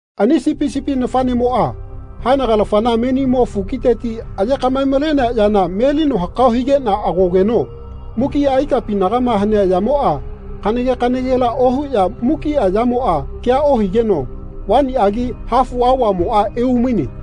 Ani Sipi sipi nafaꞌnemoꞌa haenagalafana menimo fukiteti aye kaꞌmae-malenea yana melino hakao higeꞌna agogeno mukiꞌa ikapinagama hanea yamoꞌa kanage kanagela ohuꞌya mukiꞌa yamoꞌa kea ohigeno vaniꞌagi hafu aovamoꞌa eumaine.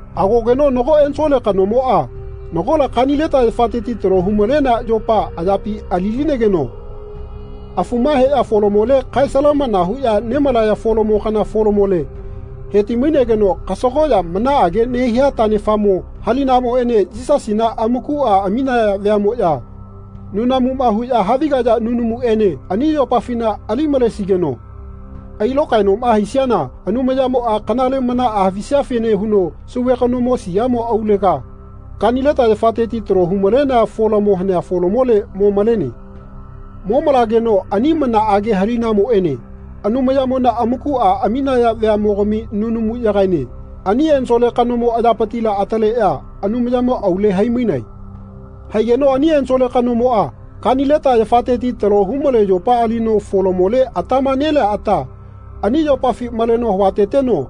Agogeno nago ensole kanomoꞌa nagola kanileta yafateti talo hu-malenea yopa ayapi ali-linegeno afuma heꞌya folamole kae salamana huꞌya nemalaya folamo kana folamole heti-mainegeno kasagoꞌya manaꞌage nehia taꞌnefamo halinamoꞌene Yisasina amakuꞌa aminaya veaꞌmoꞌya nunamuma huꞌya havigaya nunamuꞌene ani yopafina ali malesigeno ailokaenoꞌma haisiana Anumayamoꞌa kanale manaꞌa havisiafene huno sauve kanomo siamo aulega kanileta yafateti talo hu-malenea folamo hanea folamole mo malene. Momalegeno ani manaꞌage halinamoꞌene Anumaymona amakuꞌama aminaya veaꞌmogami nunamuꞌyagaene ani ensole kanomo ayapitila ataleꞌya Anumayamo aule haimainae. Haigeno ani ensole kanomoꞌa kanileta yafateti talo humale yopa alino folamole atama nelea ata ani yopafi maleno havateteno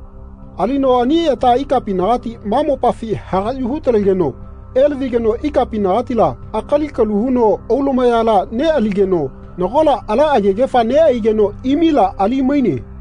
alino ani ata ikapinagati ma mopafi hagaꞌyu hu-talegeno elavigeno ikapinagatila akali kalu huno aulumayala neꞌaligeno nagola ala agegefa neꞌaigeno imila ali-maine.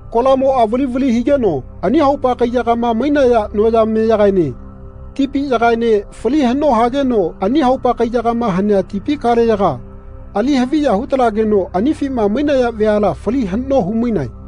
Kolamoꞌa vali vali higeno ani haupa kaiyagama mainaya noyameyagaene tipi yagaene fali haꞌno hageno ani haupa kaiyagama hanea tipi kaleyaga ali haviya hu-talageno anifima mainaya veala fali haꞌno humainae.